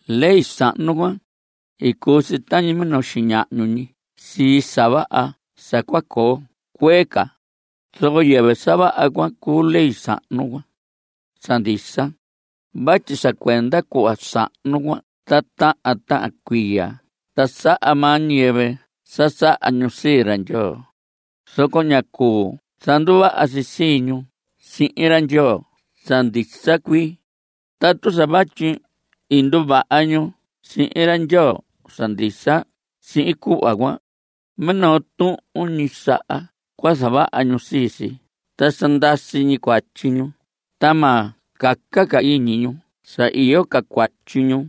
Ley sahnu cuan, i cuu si tañi minoo xiñahñu ñi sii sa vaha sa cua coo cuee ca, zoco yɨvɨ sa vaha cuan cuu ley sahnu cuan sa ndisa vatyi sa cuenda cuhva sahnu cuan ta tahan tahan cuiya ta saha maa ñiyɨvɨ sa saha ñu sii ra Ndyoo, zoco ñá cuu zanduvaha si sii ñu sihin ra Ndyoo sa ndisa cuii. Tatu sa vatyi i nduvaha ñu sihin ra Ndyoo sa ndisa sihin cuhva cuan, minoo tuhun ñi saha cua zavaha ñu sii si ta sa ndasi ñi cuatyi ñu ta ma caca ca iñi ñu sa iyo ca cuatyi ñu.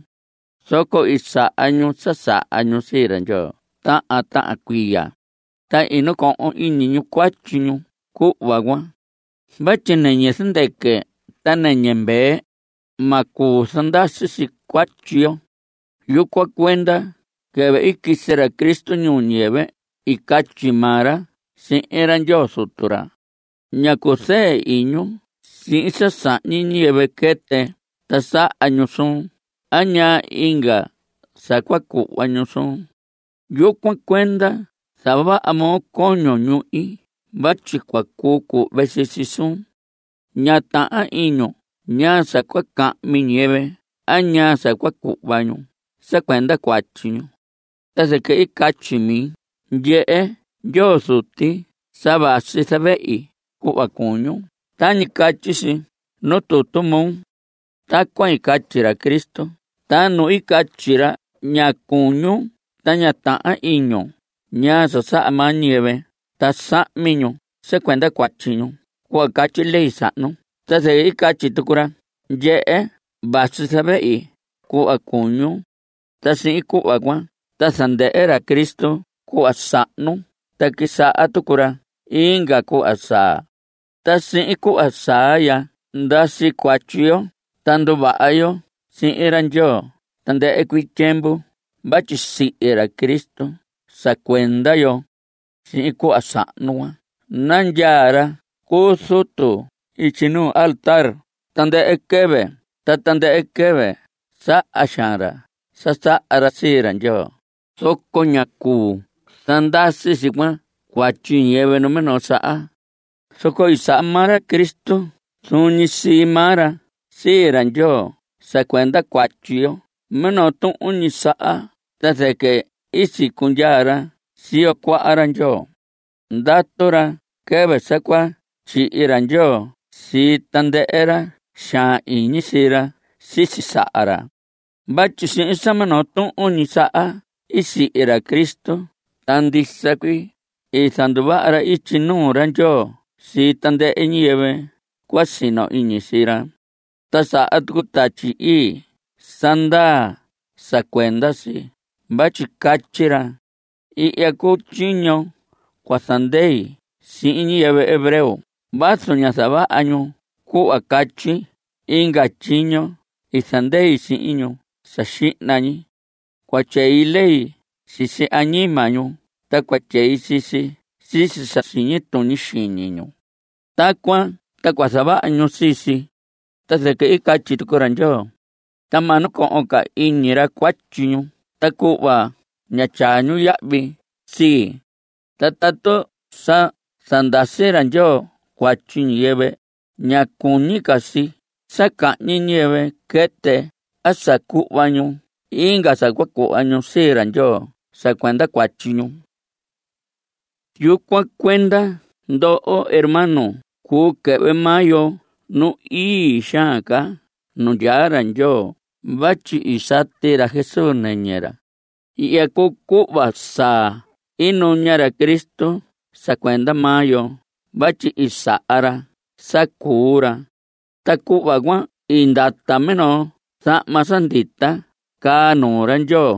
Zoco i saha ñu sa saha ñu sii ra Ndyoo tahan tahan cuiya, ta i nacohon iñi ñu cuatyi ñu cuhva cuan. Vatyi nɨñɨ zɨndɨquɨ ta nɨñɨ mvee, ma cuu zandasi si cuatyi yo. Yucuan cuenda quɨvɨ i quisi ra Cristo ñuu ñiyɨvɨ i catyi maa ra sihin ra Ndyoo Zutu ra: Ña cuzɨɨ iñun sihin sa sahñi ñiyɨvɨ quɨtɨ ta saha ñu suun a ñaa inga sa cua cuhva ñu suun. Yucuan cuenda i zavohon coño ñuhi vatyi cua cuu cuhve sii si suun. Ñá tahan iñun ñaa sa cua cahmi ñiyɨvɨ a ñaa sa cua cuhva ñu sa cuenda cuatyi ñu. Ta zɨquɨ i catyi mi: “Ndyehe Ndyoo Zuti sa vasi zavehi cuhva cuñun Tañi catyi si nuu tutu moo.” Tacuan i catyi ra Cristo, ta nu i catyi ra: “Ña cuñun ta ña tahan iñun ñaa sa saha maa ñiyɨvɨ ta sa sahmi ñu sa cuenda cuatyi ñu cuhva catyi ley sahnu”, ta zɨquɨ i catyi tucu ra: “Ndyehe, vasi zavehi cuhva cuñun.” Ta sihin cuhva cuan ta zandɨhɨ ra Cristo cuhva sahnu ta quisaha tucu ra inga cuhva saa. Ta sihin cuhva saa ya, ndasi cuatyi yo, ta nduvaha yo sihin ra Ndyoo tandɨhɨ cuii tyiemvu vatyi sihi ra Cristo sa cuenda yo. Sihin cuhva sahnu cuan nandyaa ra cu zutu ityi nuu altar tandɨhɨ quɨvɨ, ta tandɨhɨ quɨvɨ saha xaan ra sa saha ra sii ra Ndyoo, zoco ñá cuu zandasi si cuan cuatyi ñiyɨvɨ numinoo saha. Zoco i saha maa ra Cristo zuun ñi sii maa ra sii ra Ndyoo sa cuenda cuatyi yo minoo tuhun ñi saha, ta zɨquɨ i sicundyaa ra siyo cuaha ra Ndyoo. Ndatu ra quɨvɨ sa cua tyihi ra Ndyoo sii tandɨhɨ ra xaan iñi sii ra sisi saha ra. Vatyi sihin sa minoo tuhun ñi saha i sihi ra Cristo ta ndisa cuii i zanduvaha ra ityi nuu ra Ndyoo sii tandɨhɨ ñiyɨvɨ cua sino iñi sii ra. Ta saha tucu Tatyi Ii sa ndaa sa cuenda si vatyi catyi ra: Ihya cuu tyiño cua zandei sihin ñiyɨvɨ hebreo Vazu ñá zavaha ñu cuhva catyi inga tyiño i zandei sihin ñu sa xihna ñi. Cua tyei lei sisi añima ñu, Ta cua tyei sii si sisi sa siñi tuñi xiñi ñu. (Tacuan ta cua zavaha ñu sii si.) Ta zɨquɨ i catyi tucu ra Ndyoo: Ta ma nacohon ca iñi cuatyi ñu ta cuhva ñá tyaa ñu yahvi sii. Ta tatu sa zandasi ra Ndyoo cuatyi ñiyɨvɨ, ña cuñi ca si sa cahñi ñiyɨvɨ quɨtɨ a sa cuhva ñu inga sa cua cuhva ñu sii ra Ndyoo sa cuenda cuatyi ñu. Yucuan cuenda, ndoho hermanos, cuu quɨhvɨ maa yo nu ii xaan ca nu ndyaa ra Ndyoo vatyi i sati ra Jesús nɨñɨ ra. Ihya cuu cuhva saa i nuña ra Cristo sa cuenda maa yo vatyi i saha ra sa cuu ra. Ta cuhva cuan i ndata minoo zahma sa ndita caa nuu ra Ndyoo,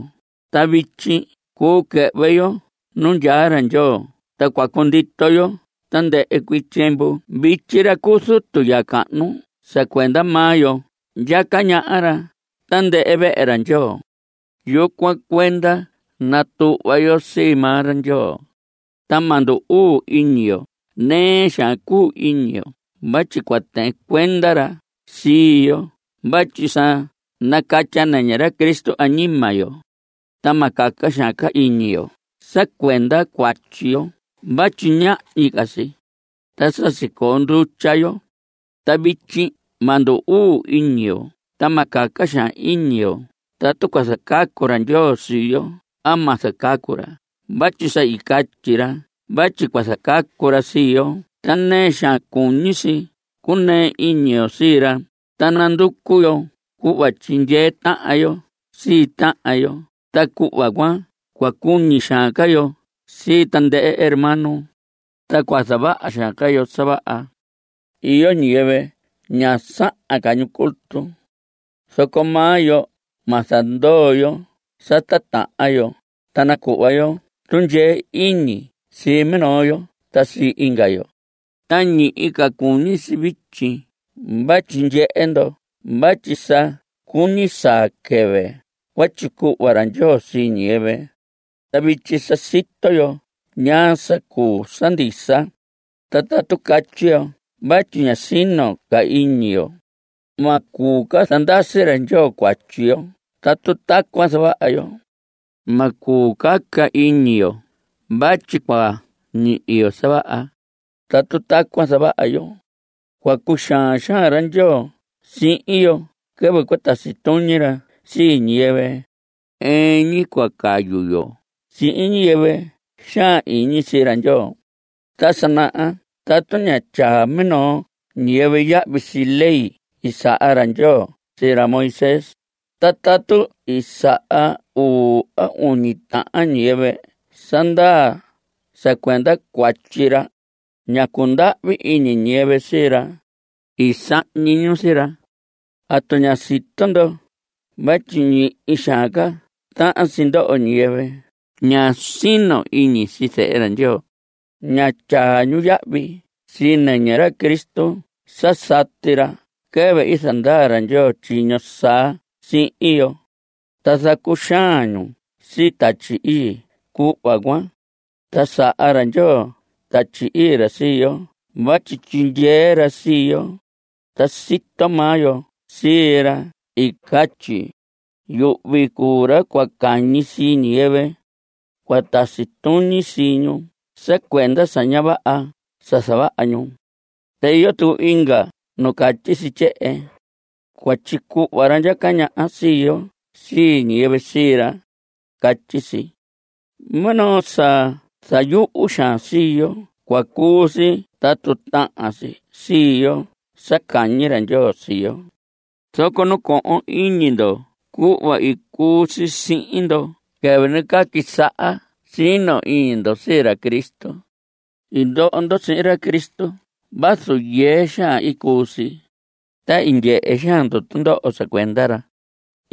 ta vityi cuu quɨhvɨ yo nu ndyaa ra Ndyoo, ta cua cundito yo tandɨhɨ cuii tyiemvu. Vityi ra cu zutu ya cahnu sa cuenda maa yo ndyaca ñaha ra tandɨhɨ vehe ra Ndyoo. Yucuan cuenda natuhva yo sii maa ra Ndyoo. Ta ma ndu‑uu iñi yo. Nɨɨ xaan cuu iñi yo vatyi cua tɨɨn cuenda ra sii yo vatyi sa nacatya nɨñɨ ra Cristo añima yo, ta ma caca xaan ca iñi yo sa cuenda cuatyi yo vatyi ñahñi ca si, ta sa sicoo ndutya yo. Ta vityi ma ndu‑uu iñi yo, ta ma caca xaan iñi yo tatu cua zacacu ra Ndyoo sii yo a ma zacacu ra vatyi sa i catyi ra vatyi cua zacacu ra sii yo, ta nɨɨ xaan cuñi si cuu iñi yo sii ra. Ta nanducu yo cuhva tyindyee tahan yo sii tahan yo, ta cuhva cuan cua cuñi xaan ca yo sii tandɨhɨ hermano, ta cua zavaha xaan ca yo sa vaha. Iyo ñiyɨvɨ ña sahan ca ñu culto, zoco maa yo ma zandoo yo sa tatahan yo. Ta nacuhva yo tundyee iñi sii minoo yo ta sii inga yo, ta ñihi ca cuñi si vityi vatyi ndyehe ndo vatyi sa cuñi saa quɨvɨ cua tyicuhva ra Ndyoo sii ñiyɨvɨ. Ta vityi sa sito yo ñaa sa cuu sa ndisa, ta tatu catyi yo vatyi ña sino ca iñi yo, ma cuu ca zandasi ra Ndyoo cuatyi yo tatu tacuan zavaha yo. Ma cuu caca iñi yo vatyi cua ñihi yo sa vaha, tatu tacuan zavaha yo. Cua cuxaan xaan ra Ndyoo sihin yo quɨvɨ cua tasi tuñi ra sii ñiyɨvɨ. Ɨɨn ñi cua cayu yo sihin ñiyɨvɨ xaan iñi sii ra Ndyoo. Ta sa naha tatu ñá tyaa minoo ñiyɨvɨ yahvi sii ley i saha ra Ndyoo sii ra Moisés, ta tatu i saha uu a uñi tahan ñiyɨvɨ sa ndaa sa cuenda cuatyi ra, ñá cundahvi iñi ñiyɨvɨ sii ra. I sahñi ñu sii ra. ¿Atu ña sito ndo vatyi ñihi xaan ca tahan si ndoho ñiyɨvɨ ña sino iñi sii Zehe ra Ndyoo? Ña tyaa ñu yahvi sii nɨñɨ ra Cristo sa sati ra quɨvɨ i zandaa ra Ndyoo tyiño saa sihin yo. Ta zacuxaan ñu sii Tatyi Ii cuhva cuan. Ta saha ra Ndyoo Tatyi Ii ra sii yo vatyi tyindyee ra sii yo. Ta sito maa yo sii ra i catyi: “Yuhvi cuu ra cua cañi sii ñiyɨvɨ. Cua tasi tuñi sii ñu sa cuenda sa ña vaha sa i zavaha ñu.” Ta iyo tucu inga nu catyi si tyehen: “Cua tyicuhva ra ndyaca ñaha sii yo sii ñiyɨvɨ sii ra.” Catyi si. Minoo sa zayuhu xaan sii yo cua cuu si tatu tahan si sii yo sa cañi ra Ndyoo sii yo. Zoco nacohon iñi ndo cuhva i cuu si sihin ndo quɨvɨ nacaa quisaha sino iñi ndo sii ra Cristo. I ndoo ndo sihin ra Cristo vazu yɨɨ xaan i cuu si, ta i ndyehe xaan ndo tundoho sa cuenda ra.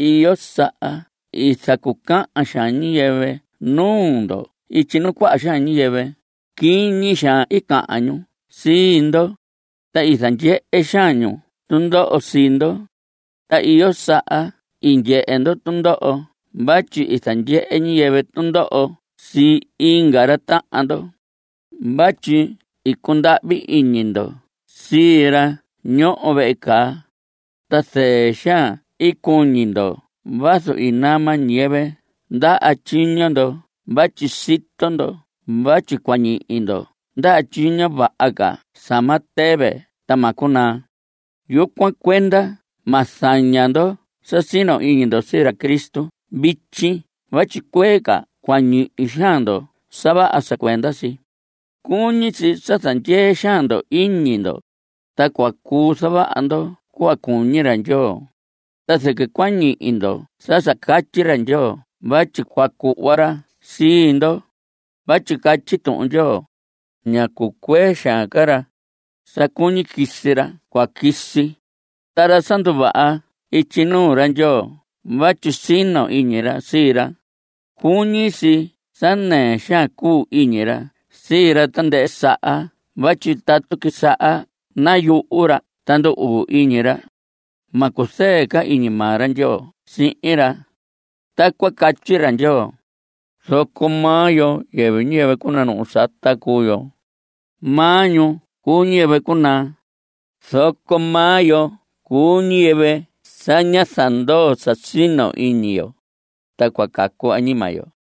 Iyo saha i zacucahan xaan ñiyɨvɨ nuu ndo ityi nuu cuaha xaan ñiyɨvɨ. Quiñi xaan i cahan ñu sii ndo, ta i zandyehe xaan ñu tundoho sii ndo. Ta iyo saha i ndyehe ndo tundoho vatyi i zandyehe ñiyɨvɨ tundoho sii inga ra tahan ndo. Vatyi i cundahvi iñi ndo sii ra ñoho vehe caa. Ta zɨɨ xaan i cuñi ndo vazu i nama ñiyɨvɨ ndaha tyiño ndo vatyi sito ndo vatyi cua ñihi ndo ndaha tyiño vaha ca sa ma tɨvɨ ta ma cunaa. Yucuan cuenda ma zaña ndo sa sino iñi ndo sii ra Cristo vityi vatyi cuee ca cua ñihi xaan ndo sa vaha sa cuenda si. Cuñi si sa zandyee xaan ndo iñi ndo, ta cua cuu zavaha ndo cuhva cuñi ra Ndyoo, ta zɨquɨ cua ñihi ndo sa sa catyi ra Ndyoo vatyi cua cuhva ra sii ndo. Vatyi catyi Tuhun Ndyoo: “Ña cucuee xaan ca ra. Sa cuñi quisi ra cua quisi. Ta ra sa nduvaha ityi nuu ra Ndyoo vatyi sino iñi ra sii ra, cuñi si sa nɨɨ xaan cuu iñi ra sii ra tandɨhɨ saha vatyi tatu quisaha nayuhu ra ta ndu‑uu iñi ra, ma cuzɨɨ ca iñi maa ra Ndyoo sihin ra.” Tacuan catyi ra Ndyoo. Zoco maa yo, yɨvɨ ñiyɨvɨ cunanuhu sata cuu yo. Maa ñu cuu ñiyɨvɨ cunaa. Zoco maa yo cuu ñiyɨvɨ sa ña zandoo sa sino iñi yo, ta cua cacu añima yo.